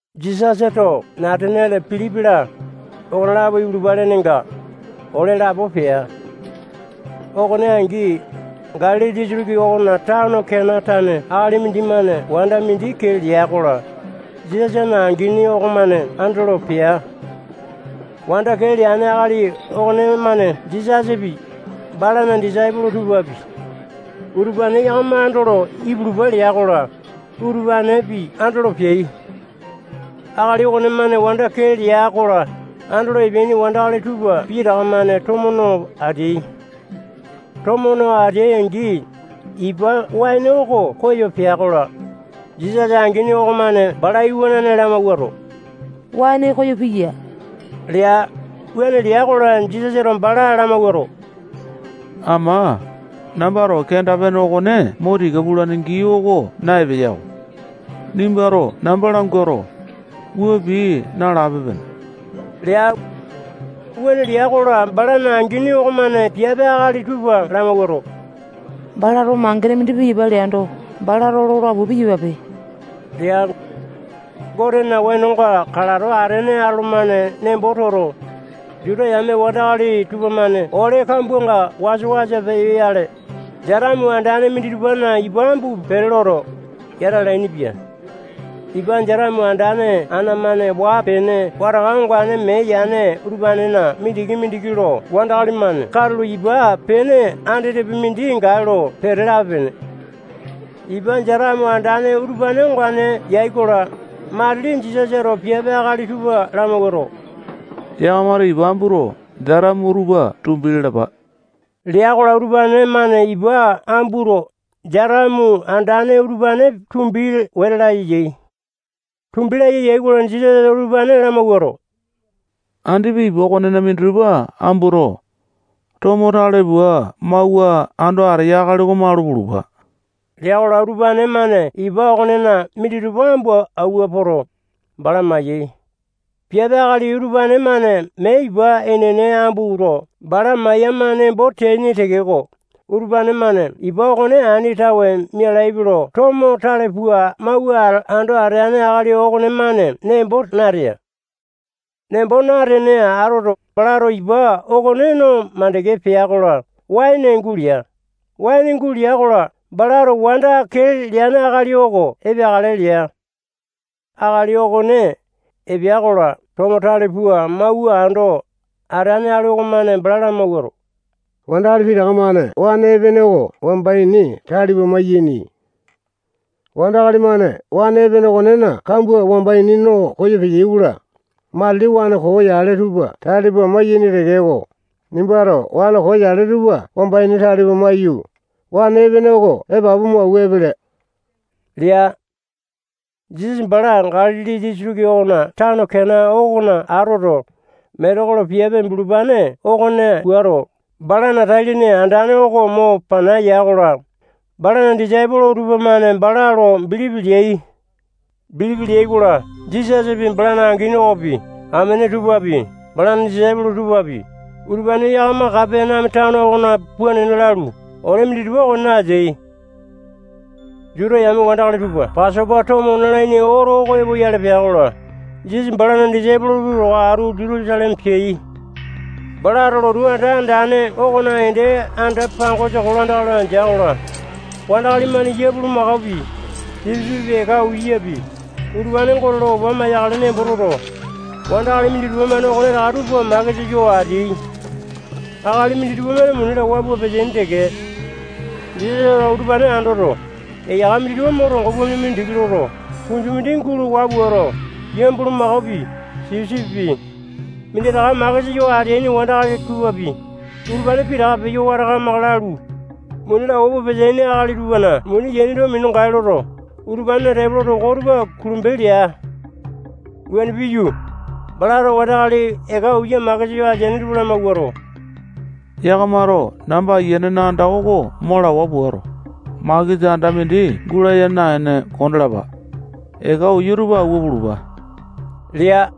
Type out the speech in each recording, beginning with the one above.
Jisasato Nataniale Pilipi-la, okonelapo ipulupa lenenga, ole lapo pea. Okone angi, Galili disitiki okona tano Kena tane akali mindimane wanda mindi kee lea-kola, Jisasana angini okomane andolo pea. Wanda kee leane akali okonemane Jisasapi, balana disaipolo tupapi, utupane yakama andolo ipulupa lea-kola, utupanepi andolo peai. Akali okonemane wanda kee lea-kola, andolo epeaini wandakali tupa pitaka-mane tomo no ateai. Tomo no ateai-angi, ipa waene oko koyo pea-kola, Jisasa angini okomane bala iwanane lamawuato, waene koyo piya lea. Wuane lea-kola, Jisasato bala lamawuato, ama, nambato kenda-pene okone mo tika pulane gii oko na-epeyako. Nimbato namba languato, wua pii nalape-pene lea. Wuane lea-kola, balana angini okomane piape akali tupa lamawuato, balato mangene mindi piyapa leando, balato lola pua piyapape lea. Gotena wenonga kalato atene atolomane nembo toto, Juta yame wandakali tupamane ole kambuanga wasa-wasa peyoyale, jatamu andane minditupana ipa ambu pete loto, yata alainipia. Ipa jatamu andane ana-mane waa-pene wataka ongane mee yane utupanena mindiki-mindiki lo wandakali-mane katulo ipa pene andetepi mindi gae lo pete lape-pene. Ipa jatamu andane utupane ongane yai-kola, matili Jisasato piape akali tupa lamawuato, yakamato ipa ambuto, jatamu utupa tumbi lalapa lea-kola, utupane-mane ipa ambuto, jatamu andane utupane tumbi wete laya yai. Tumbi laya yai-kola, Jisasato utupane lamawuato, andipa ipa okonena minditupa ambuto, tomo tale pua mawua ando ateya akali oko malu pulupa lea-kola, utupane-mane ipa okonena minditupa ambu awua poto, bala maiyai. Piape akali utupane-mane mee ipa enene ambuto, bala maiyama nembo teaini tekeko, utupane-mane ipa okone ani tawe mialaipe lo tomo tale pua mawua ando ateane akali okonemane nembo natea. Nembo natene atoto, balato ipa okone no makande pea-kola, waene gulea. Waene gulea-kola, balato wanda kee leane akali oko epeakale lea. Akali okone epea-kola, tomo tale pua mawua ando ateane akali okomane bala lamawuato, wandakali pitaka-mane waene epene oko wamba ini tale pua maiyaini. Wandakali-mane waene epene okonena kambua wamba ini no koyo peyai-kola, matili waene koo yale tupa tale pua maiyaini tekeko, nimbato waene koo yale tupa wamba ini tale pua maiyu, waene epene oko epapu mo awua epele lea. Jisasa bala Galili disitiki okona tano Kena okona atoto, metekolo piape bulupane okone puato, balana tai-lene andane oko mo pana ya-kola, balana disaipolo tupamane bala lo bilipi leai. Bilipi leai-kola, Jisasapi, balana angini okopi, amene tupapi, balana disaipolo tupapi, utupane yakama Kapaneame tano okona puu nena lalu, ole minditupa okonena ateai. Juta yame wandakali tupa Pasopa tomo nalaini oto oko epoyale pea-kola, Jisasa balana disaipolo tupa towa atu Jutusaleme peai. Balato lotu anda andane okona ende anda-pangosa kolandaka loto andea-kola, wandakali-mane yia bulumakopi, sipisipipi, eka uyapi, utupane Gote lo opa maiyakale nembo toto, wandakali minditupa-mane okonetaka tupa makesa yo ateai. Akali minditupa-mane muni lawa pua peteaini teke. Jisasato utupane andoto, eyaka minditupa mo tongo pua mina mindiki loto, kunju mindi gulo waa puato, yia bulumakopi, sipisipipi, minditaka makesa yo ateaini wandakali tupapi, utupane pitaka peyo wata kamaka lalu, muni lawa pua peteaini akali tupana muni yaini tupa minu gae loto, utupanena tepolo toko tupa kulembo lea. Wuane piyu, balato wandakali eka uya makesa yo ateaini tupa lamawuato, yakamato namba Ayianena anda oko mo lawa puato, makesa anda mindi gulaya naene kondalapa. Eka uya utupa awua pulupa lea.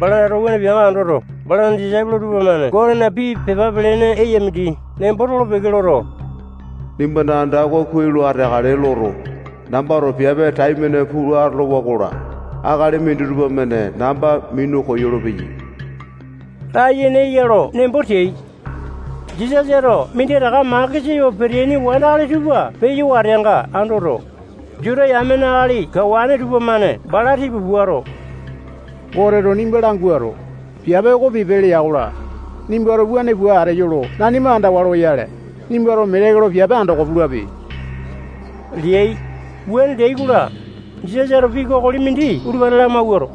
Balato wuane peanga andoto, balana disaipolo tupamane Gotena pii pepa pelene eya mindi nembo tolo-peke loto, nimbana anda oko kuai lo ateakale loto, nambato piape taimane pua atolowa-kola, akali minditupa-mane namba minu koyolo-peyai layene eya lo nembo teai. Jisasato minditaka makesa yo peteaini wandakali tupa peyo wateanga andoto, Juta yamena akali kawane tupamane bala tipa puato, Goteto nimba languato, piape oko pipe lea-kola, nimbato wuane pua ateyo lo nanima andawa loyale, nimbato metekolo piape andoko pulape leai. Wuane leai-kola, Jisasato pii kokoli mindi utupane lamawuato,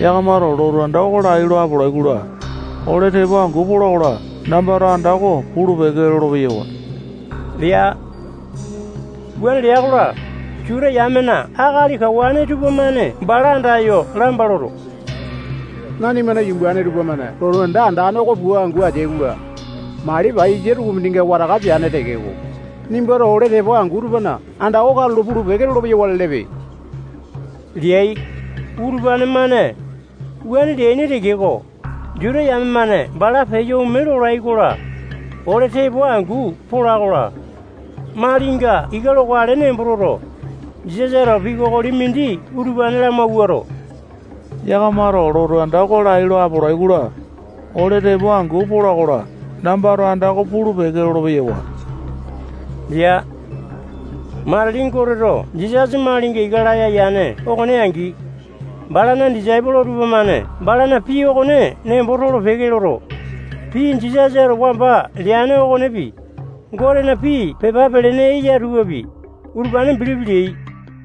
yakamato lotu anda oko lai lo apolai-kola, ole tepo angu pola-kola, nambato anda oko pulu-peke lolo-peyawa lea. Wuane lea-kola, Juta yamena akali kawane tupamane bala andayo lamba loto, nanimana yumbane tupamane lotu anda andane oko pua angu ateai-kola, mali paiyasa tukumindinga wataka peane tekeko, nimbato ole tepo angu tupana anda oko katulo pulu-peke lolo-peyawa lelepe leai. Utupane-mane wuane leaini tekeko, Juta yame-mane bala peyo ome lolai-kola, ole tepo angu pola-kola, malinga ika lokale nembo toto, Jisasato pii kokoli mindi utupane lamawuato, yakamato lotu anda oko lai lo apolai-kola, ole tepo angu pola-kola, nambato anda oko pulu-peke lolo-peyawa lea. Matili Goteto Jisasa malinga ika laya yane okone angi, balana disaipolo tupamane balana pii okone nembo tolo-peke loto, pii Jisasato wamba leane okonepi, Gotena pii pepa pelene eya tupapi, utupane bilipi leai.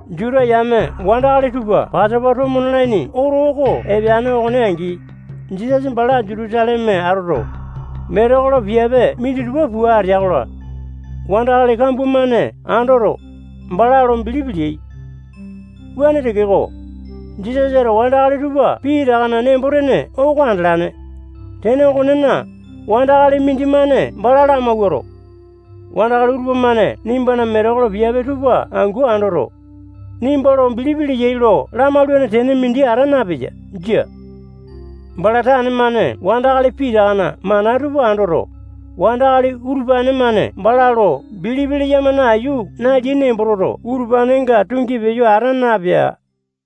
Juta yame wandakali tupa Pasopa tomo nalaini oto oko epeane okone angi, Jisasa bala Jutusaleme atoto, metekolo piape minditupa pua atea-kola, wandakali kambua-mane andoto, bala lo bilipi leai. Wuane tekeko, Jisasato wandakali tupa pitakana nembo-tene oko andalane. Tene okonena, wandakali mindimane bala lamawuato, wandakali utupa-mane nimbana metekolo piape tupa angu andoto, nimba lo bilipi leyai lo lamaulane tene mindi ata napeya. Jia. Bala tane-mane wandakali pitakana mana tupa andoto, wandakali utupane-mane bala lo bilipi leyama nayu naleai nembo toto, utupanenga tungi peyo ata napea.